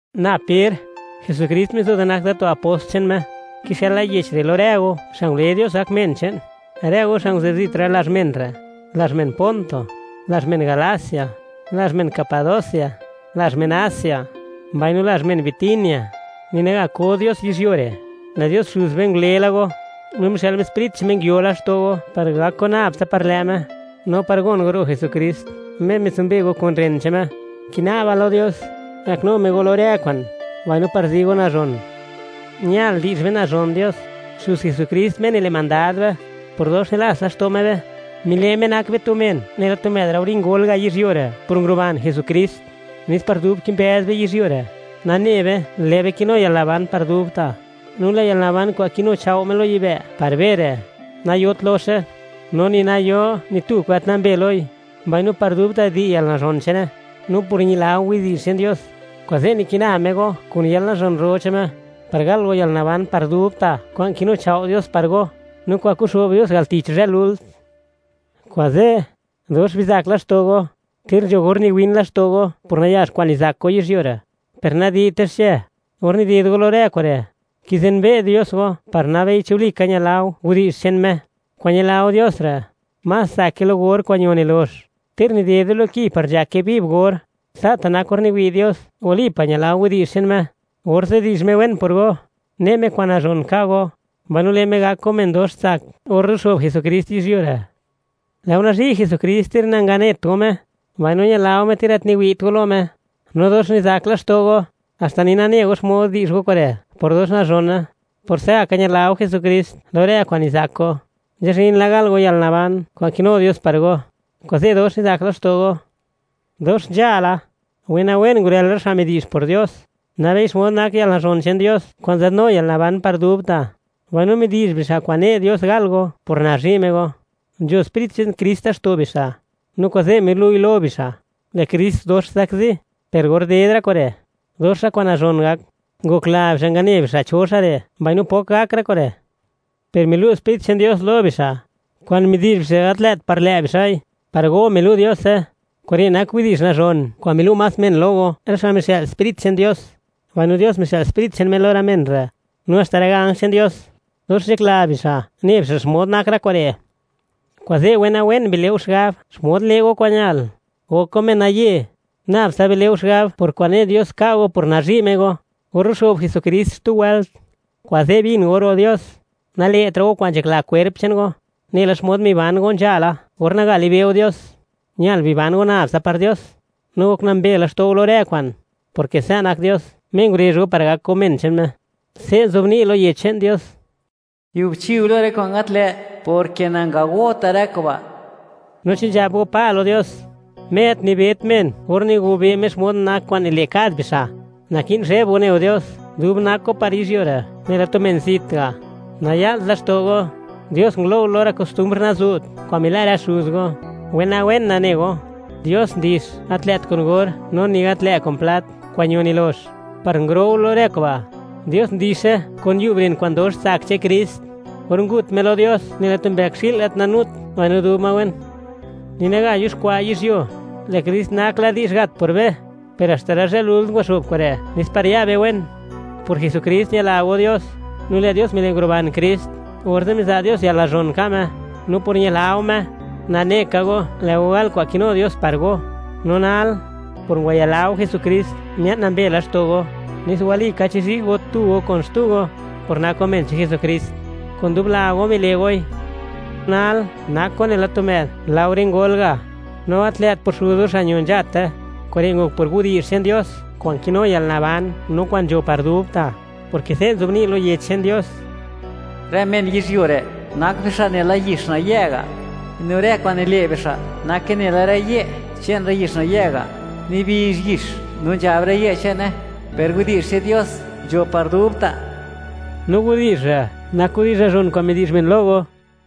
Na Per; Jesukrist mizo da nak da tu apost che'n Me; kixëla yech re' lo rë go xa' ngule Dios gak men che'n, rë go xa' nguzë'b zit rë lazh rë men re': lazh men Ponto, lazh men Galacia, lazh men Capadocia, lazh men Asia, mbaino lazh men Bitinia. Ni naga ko Dios yizhyuo re', lë' Dios Xuz be ngule la go, no mixë'l Me Sprit che'n Me nguio laxto' go par gak go nab tsa par lë' Me, no par gon go ro' Jesukrist, Me mitsumbe go kun ren che'n Me. Kina'ba lo Dios, gaknu Me go lo rë kwa'n, mbaino par zi go nazhon. Ñal di'zh be nazhon Dios, Xuz Jesukrist, Me nile' mandad be. Por dox nilats laxto' Me be, mile' Me nak be tu men nela tu më'd laore ngol ga' yizhyuo re' por nguruban Jesukrist, nes par dub kimbëz be yizhyuo re', nane be, lë' be kinu yalnaban par dubta'. No lë' yalnaban kwa'n kinuchao' Me lo yibë' par be re', nayot loxe, no ni nayo ni tu kwa'n gat nambe loi, mbaino par dubta' di' yalnazhon che'ne. No por ñila go widi'zh che'n Dios, kuze' nikina Me go kun yalnazhon ro che'n Me, par gal go yalnaban par dubta' kwa'n kinuchao' Dios par go, no kwa'n kuxo'b Dios al tich zhë lult. Kuze', dox bizak laxto' go, ter nzho or niwin laxto' go por nayax kwa'n nizak go yizhyuo re', per nadi'te xche. Or nided go lo rë kure', kizenbe' Dios go (kiwi' Dios xmod nak go) par nabei chi walika ñila go widi'zh che'n Me. Kwa'n ñila go Dios re', más tsake lo or kwa'n ño nilox, ter nidede lo ki par nzhake viv or; sa'ta' nak or niwi' Dios, walika ñila go widi'zh che'n Me, orze' di'zh Me wen por go, ne' Me kwa'n nazhon ka' go, mbaino le' Me gak go men dox tsak or ruxo'b Jesukrist yizhyuo re'. Lë' go nazhi' Jesukrist ter nanganet go Me; no ñila go Me ter gat niwi't go lo Me, mbaino dox nizak laxto' go, haxta ni nane go xmod di'zh go kure' por dox nazhone. Por se'gaka ñila go Jesukrist lo rë kwa'n nizak go, nzhazhin la gal go yalnaban kwa'n kinu Dios par go, kuze' dox nizak laxto' go. Dox nzhala, wenawen ngurël rë xa' midi'zh por Dios, nabei xmod nak yalnazhon che'n Dios kwa'n nzadnu yalanaban par dubta', mbaino midi'zh bixa' kwa'n ne' Dios gal go por nazhi' Me go. Nzho Sprit che'n Krist laxto' bixa', no kuze' milu'i lo bixa', lë' Krist dox zakzi, per or ded rë kure', dox rë kwa'n nazhon gak. Ngokla bixa' ngane bixa' cho xa' re' mbaino pok gak rë kure', per milu' Sprit che'n Dios lo bixa', kwa'n midi'zh bixa' gat lë't par lë' bixa'i; par go milu' Diose. Kure' nak widi'zh nazhon kwa'n milu' más men lo go, rë xa' mixë'l Sprit che'n Dios, mbaino Dios mixë'l Sprit che'n Me lo rë men re'. No haxta rë ganj che'n Dios, dox nzhakla bixa', ne bixa' xmod nak rë kure'. Kuze', wenawen bile' go xigab xmod le' go kwa'n ñal; gok go menaye; nab tsa bile' go xigab por kwa'n ne' Dios ka' go por nazhi' Me go, or ruxo'b Jesukrist xtu wëlt. Kuze' bin go ro' Dios; nale'tra' go kwa'n nzhakla kwerp che'n go, nela xmod miban go nzhala, or naga libe' go Dios; ñal biban go nab tsa par Dios, no gok nambe laxto' go lo rë kwa'n, porke sa' nak Dios, Me ngurezh go par gak go men che'n Me. Se' nzobni' lo Yech che'n Dios: “Giubchi go lo rë kwa'n gat lë', porke nangagota' rë kuba'.” No chi nzhab go: “Pa” lo Dios, Me gat nibet men or nigobe' Me xmod nak kwa'n nile' kad bixa', naki'n zheb go ne go Dios, dub nak go par yizhyuo re', nela tu men zit ga'. Naya'lt laxto' go, Dios ngulo' go lo rë kostumbr nazu't kwa'n mila' rë xuz go; wenawen nane go, Dios ndix, gat lë't kun or no ni gat lë' kun plat kwa'n ño nilox, par nguro' go lo rë kuba'; Dios ndixe kun yub ren kwa'n dox tsak che'n Krist; or ngut Me lo Dios nela tu mbëkxi'l gat nanut mbaino dub ma wen. Ni naga yuxkwa' yizhyuo, lë' Krist nak la di'zh gat por be; per haxta rë zhë lult ngwaxo'b kure' nes par ya be wen. Por Jesukrist, ñila go Dios; no lë' Dios mile' nguruban Krist, orze' miza' Dios yalnazhon ka' Me. No por ñila go Me, nane ka go lë' go gal kwa'n kinu Dios par go. No nal, por ngwayila go Jesukrist, mia'n nambe laxto' go, nes walika chizhi' go tu go no kun xtu go, por nak go men che'n Jesukrist. Kun dub la go, bile' goi. Nal, nak go nela tu më'd laore ngol ga', no gat lë't por xuz go xa' ño nzhate; kure' ngok por widi'zh che'n Dios, kwa'n kinu yalnaban no kwa'n nzho par dubta'; porke se' nzobni' lo Yech che'n Dios: Rë men yizhyuo re', nak bixa' nela yix nayë' ga'. No rë kwa'n nile' bixa' nake nela rë ye' che'n rë yix nayë' ga'; nibizh yix no nzhab rë ye' che'ne, per widi'zh che'n Dios, nzho par dubta'. No widi'zh re' nak widi'zh nazhon kwa'n midi'zh men lo go.